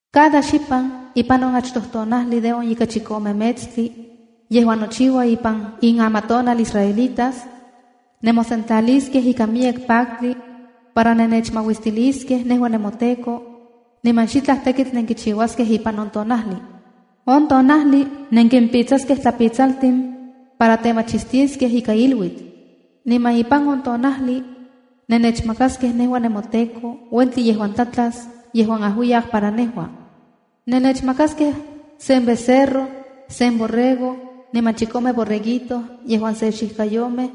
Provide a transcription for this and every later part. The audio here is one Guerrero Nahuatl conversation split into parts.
“Cada xipan ipan on achtoj tonajli de on ika chikome metstli yejuan nochiua ipan in amatonal israelitas, nemosentlaliskej ikan miyek paktli para nennechmauistiliskej nejua nemoTEKO, niman xitlaj tekitl nenkichiuaskej ipan on tonajli. On tonajli nenkimpitsaskej tlapitsaltin para temachistiskej ika iluitl. Niman ipan on tonajli nennechmakaskej nejua nemoTEKO uentli yejuan tlatlas, yejuan ajuiyak para yejua. Nennechmakaskej sen becerro, sen borrego, niman chikome borreguito yejuan se xijkayomej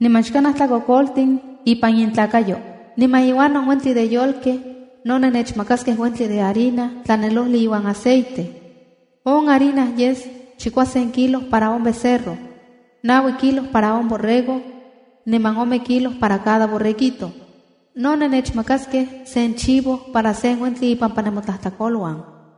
niman xkanaj tlakokoltin ipan intlakayo. Niman iuan on uentli de yolkej no nennechmakaskej uentli de harina tlanelojli iuan aceite. On harina yes chikuasen kilo para on becerro, naui kilo para on borrego, niman ome kilo para cada borreguito. No nennechmakaskej sen chivo para sen uentli ipampa nemotlajtlakoluan.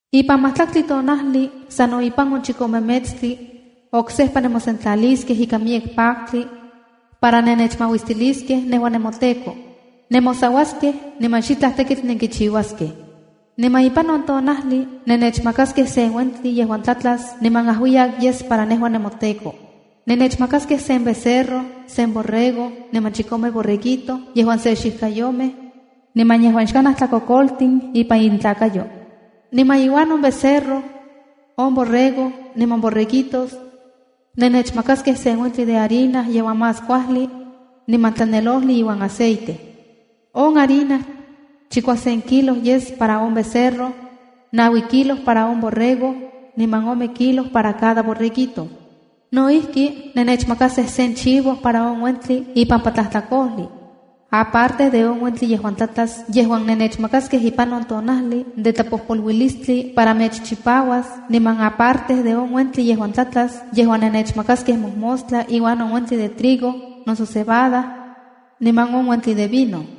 ’Ipan majtlaktli tonajli sano ipan on chikome metstli, oksejpa nemosentlaliskej ikan miyek paktli para nenechmauistiliskej nejua nemoTEKO. Nemosauaskej niman xitlaj tekitl nenkichiuaskej. Niman ipan on tonajli nennechmakaskej sen uentli yejuan tlatlas niman ajuiyak yes para nejua nemoTEKO. Nennechmakaskej sen becerro, sen borrego, niman chikome borreguito yejuan se xijkayomej, niman yejuan xkanaj tlakokoltin ipan intlakayo. Niman iuan on becerro, on borrego niman borreguitos, nennechmakaskej sen uentli de harina yejuan más kuajli niman tlanelojli iuan aceite. On harina chikuasen kilo yes para on becerro, naui kilo para on borrego, niman ome kilo para cada borreguito. No ijki, nennechmakaskej sen chivo para on uentli ipampa tlajtlakojli, aparte de on uentli yejuan tlatlas yejuan nennechmakaskej ipan on Tonajli de Tlapojpoluilistli, para mechchipauas, niman aparte de on uentli yejuan tlatlas yejuan nennechmakaskej mojmostla iuan on uentli de trigo noso cebada niman on uentli de vino.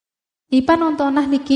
’Ipan on tonajli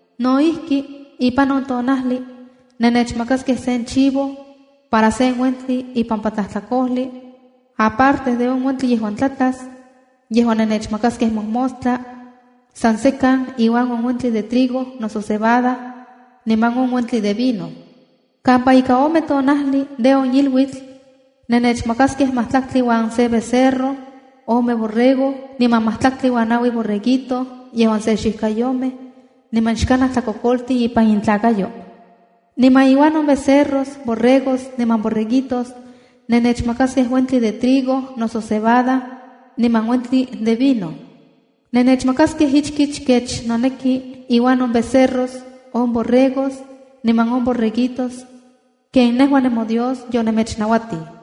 No ijki, ipan on tonajli nennechmakaskej sen chivo para on uentli ipampa tlajtlakojli, aparte de on uentli yejuan tlatlas, yejuan nennechmakaskej mojmostla, san sekan iuan on uentli de trigo noso cebada niman on uentli de vino. ’Kampa ika ome tonajli de on iluitl, nennechmakaskej majtlaktli uan se becerro, ome borrego, niman majtlaktli uan naui borreguito yejuan se xijkayomej niman xkanaj tlakokoltin ipan intlakayo. Niman iuan on becerros, borregos niman borreguitos, nennechmakaskej uentli de trigo noso cebada, niman uentli de vino. Nennechmakaskej ichkich kech noneki iuan on becerros, on borregos niman on borreguitos ken nejua nemoDios yomechnauatij.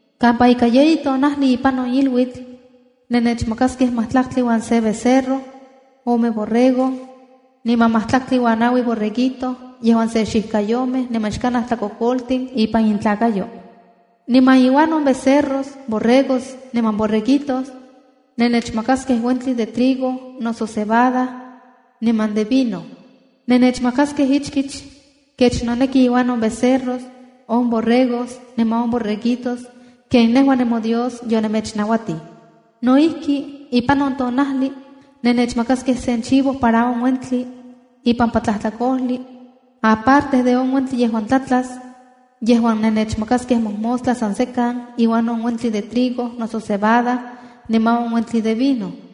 ’Kampa ika yeyi tonajli ipan on iluitl, nennechmakaskej majtlaktli uan se becerro, ome borrego, niman majtlaktli uan naui borreguito yejuan se xijkayomej niman xkanaj tlakokoltin ipan intlakayo. Niman iuan on becerros, borregos niman borreguitos, nennechmakaskej uentli de trigo noso cebada niman de vino. Nennechmakaskej ichkich kech noneki iuan on becerros, on borregos niman on borreguitos ken toDios yomechnauatij. No ijki, ipan on tonajli nennechmakaskej sen chivo para on uentli ipampa tlajtlakojli aparte de on uentli yejuan tlatlas, yejuan nennechmakaskej mojmostla san sekan iuan on uentli de trigo noso cebada niman on uentli de vino.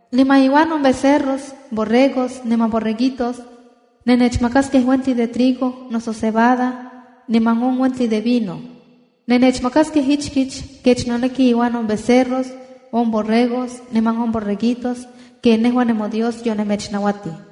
Niman iuan on becerros, borregos niman borreguitos, nennechmakaskej uentli de trigo noso cebada niman on uentli de vino. Nennechmakaskej ichkich kech noneki iuan on becerros, on borregos niman on borreguitos ken nejua nemoDios yonemechnauatij.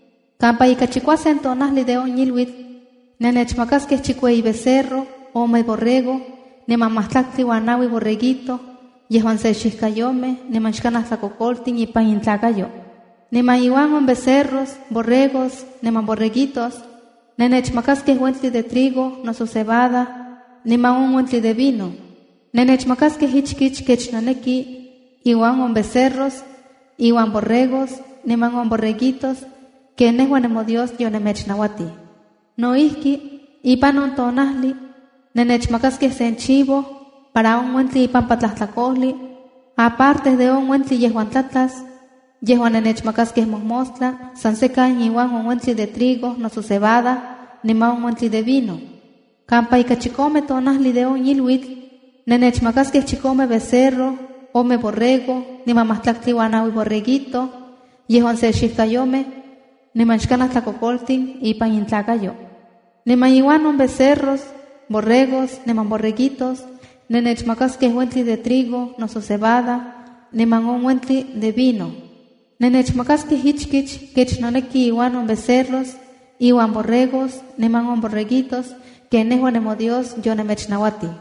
’Kampa ika chikuasen tonajli de on iluitl, nennechmakasej chikueyi becerro, ome borrego niman majtlaktli uan naui borreguito yejuan se xijkayomej niman xkanaj tlakokoltin ipan intlakayo. Niman iuan on becerros, borregos niman borreguitos, nennechmakaskej uentli de trigo noso cebada niman on uentli de vino. Nennechmakaskej ichkich kech noneki iuan on becerros, iuan borregos, niman on borreguitos ken nejua nemoDios yonemechnauatij. No ijki, ipan on tonajli, nennechmakaskej sen chivo para on uentli ipampa tlajtlakojli, aparte de on uentli yejuan tlatlas, yejuan nennechmakaskej mojmostla san sekan iuan on uentli de trigo noso cebada niman on uentli de vino. ’Kampa ika chikome tonajli de on iluitl, nennechmakaskej chikome becerro, ome borrego niman majtlaktli uan naui borreguito yejuan se xijkayomej niman xkanaj tlakokoltin ipan intlakayo. Niman iuan on becerros, borregos niman borreguitos, nennechmakaskej uentli de trigo noso cebada niman on uentli de vino. Nennechmakaskej ichkich kech noneki iuan on becerros, iuan borregos, niman on borreguitos ken nejua nemoDios yomechnauati.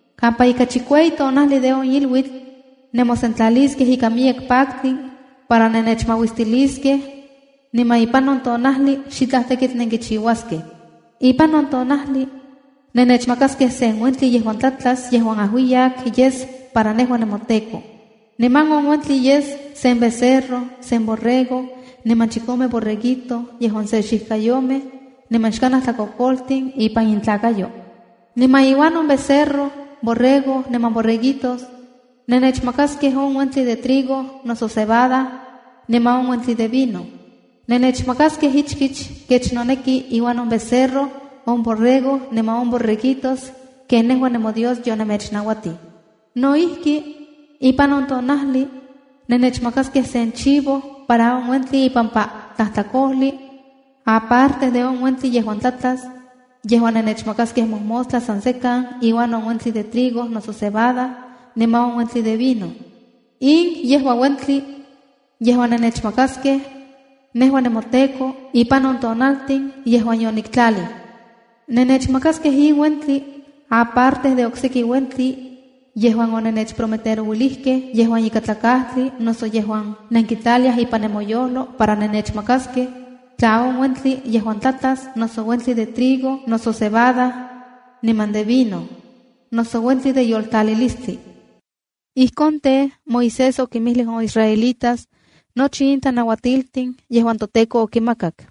’Kampa ika chikueyi tonajli de on iluitl, nemosentlaliskej ikan miyek paktli para nennechmauistiliskej, niman ipan on tonajli xitlaj tekitl nenkichiuaskej. Ipan on tonajli nennechmakaskej sen uentli yejuan tlatlas yejuan ajuiyak yes para nejua nemoTEKO. Niman on uentli yes sen becerro, sen borrego, niman chikome borreguito yejuan se xijkayomej niman xkanaj tlakokoltin ipan intlalnakayo. Niman iuan on becerro, borrego niman borreguitos, nennechmakaskej on uentli de trigo noso cebada niman on uentli de vino. Nennechmakaskej ichkich kech noneki iuan on becerro, on borrego niman on borreguitos ken nejua nemoDios yonemechnauatij. No ijki, ipan on tonajli, nennechmakaskej sen chivo para on uentli ipampa tlajtlakojli, aparte de on uentli yejuan tlatlas, yejuan nennechmakaskej mojmostla san sekan iuan on uentli de trigo noso cebada niman on uentli de vino. ’In yejua uentli yejuan nenechmakaskej nejua nemoTEKO, ipan on tonaltin yejuan yoniktlalij. Nennechmakaskej in uentli aparte de okseki uentli yejuan onennechprometerouilijkej yejuan ikatlakajtli noso yejuan nenkitlaliaj ipan nemoyojlo para nennechmakaskej, tla on uentli yejuan tlatlas, noso uentli de trigo noso cebada niman de vino, noso uentli de yoltlalilistli.” Ijkon tej, Moisés okinmijlij on israelitas nochi in tlanauatiltin yejuan toTEKO okimakak.